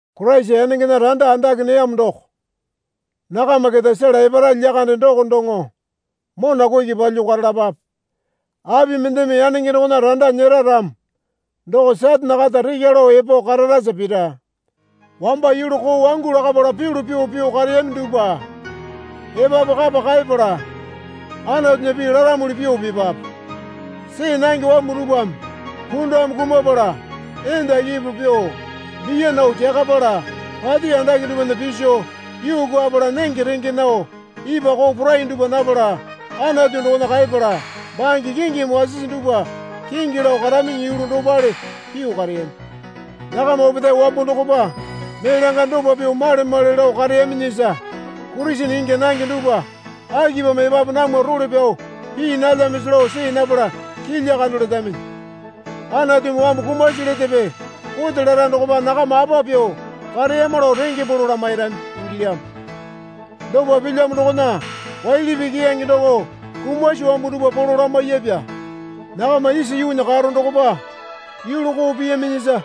Koraisa yanengena randa andake neyamo doko nakama keta sela epara lyakande doko doŋo mona kuki palyuo karalapape. Api mendeme yanenge dokona randa nyera ramo doko Satane kata rekya lao epo kararasa pira. Wamba yulu koo wangu lakapala pyulu pyuo pyuo kareyami dupwa epapu kapa kaepala Anatunya pii laramuli pyuo pipape. See nange wambu dupwame pundame kumapala, enda kepo pyuo, biya nao kyakapala, pati andake dupwana piso yuu kwuapala nenge renge nao ipwa koo porai dupwa napala Anatu dokona kaeyapala bange kingimi wasisi dupwa kingi lao karaminyi yulu dopale pyuo kareyami. Nakama opetae wambo dokopa mee langa dopa pyuo male male lao kareyaminyisa Kurisene ingya nange dupwa akipamo epapu namwa role pyao pii nalyamisi lao see napala kilya kando letaminyi. Anatumi wambu kumasi letepe kote lara dokopa nakama apa pyuo kareyama lao renge polo lamairami ingilyamo. Dopa pilyamo dokona waili pii keyange doko kumasi wambu dupwa polo lamaiyapya. Nakama isa yuunya karo dokopa yulu koo piyaminyisa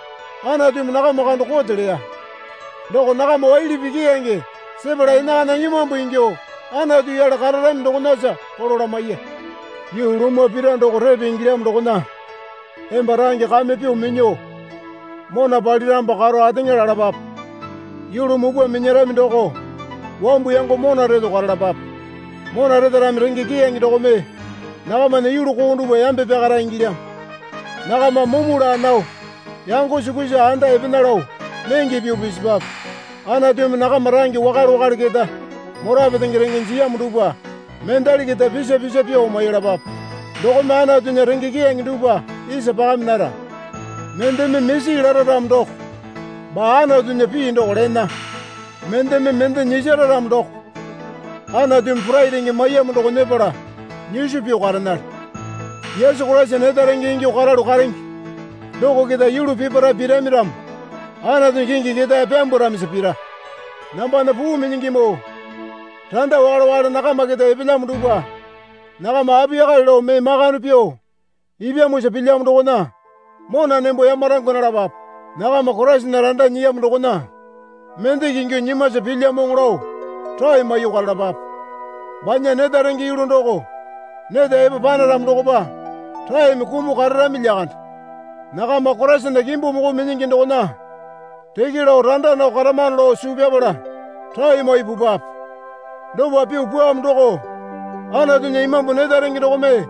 Anatumi nakama kando kote leya. Doko nakama waili pii keyange sepala enakana imambu ingyuo Anatu yale kararami dokonasa polo lamaiya. Yuu lumwa pira doko repe ingilyamo dokona emba range kame pyuo minyuo mona paliramopa karo ateŋa lalapape. Yulu mupwa minyarami doko wambu yango mona reto karalapape. Mona retarami renge keyange dokome nakamana yulu koo dupwa yambe pyakara ingilyamo. Nakama mumu laa nao yango sukusa anda epena lao nenge pyuo pisipwape. Anatumi nakama range wakale wakale keta mora petenge renge jiyamo dupwa mendali keta pisa pisa pyuo maiyalapape. Dokome Anatunya renge keyange dupwa isa pakami nara. Mendeme misi lara ramo doko baa Anatunya pii doko lena. Mendeme mende nyisara ramo doko Anatumi porai renge maiyamo doko nyepala nyiso pyuo karenale. Yesu Koraisa neta renge ingyuo karalu karenge doko keta yulu peparae pirami ramo Anatunya kingi ketae pyambwaramisa pira. Nambana puu minyingimoo. Randa wakale wakale nakama keta epelyamo dupwa nakama apiyakale lao mee makande pyuo ipyamosa pilyamo dokona mona nembo yamarangwa nalapape. Nakama Koraisana randa nyiyamo dokona mendeke ingyuo nyimwasa pilyamoŋo lao rae maiyuo karalapape. Banya neta renge yulu doko neta epo panaramo dokopa raeme kumuo kararami lyakande. Nakama Koraisana kimbu moko minyingi dokona reke lao randa nao karamano lao suu pyapala rae maiyuo pupwape. Dopa pyuo pwuamo doko Anatunya Imambu neta renge dokome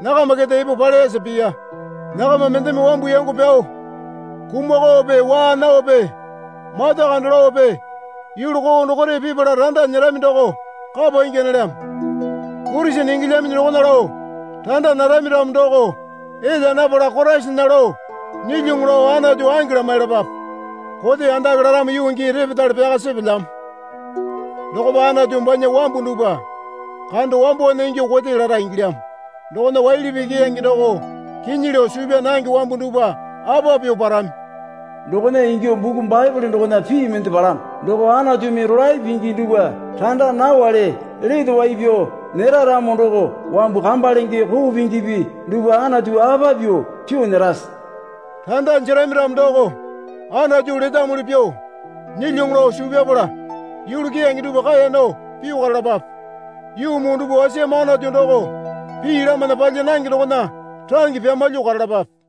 nakama keta epo paleyasa piya. Nakama mendeme wambu yango pyao kumakaope waa naope mata kando laope yulu koo dokore pipala randa nyerami doko kapa ingya nalyamo. Kurisene ingilyaminyi dokona lao randa narami ramo doko elya napala Koraisana lao nyilyuŋu lao Anatu ange lamailapape. Kote andake laramo yuu gii repetale pyaka sepelyamo dokopa Anatu banya wambu dupwa kando wambowana ingyuo kote lara ingilyamo dokona waili pii keyange doko kinyi lao suu pyaa nange wambu dupwa apa pyuo parami? Dokona ingyuo buku Baepole dokona pii mende palamo. Doko Anatumi rolae pingi dupwa randa nawali lete wai pyao nyera ramo doko, wambu kamba lenge koo pingipi dupwa Anatu apa pyuo pyuo nyerase? Randa jerami ramo doko Anatu letamuli pyuo nyilyuŋu lao suu pyapala yulu keyange dupwa kaeya nao pyuo karalapape. Yuu muu dupwa wasiyamo Anatu doko pii lamana palya nange dokona range pyamalyuo karalapape.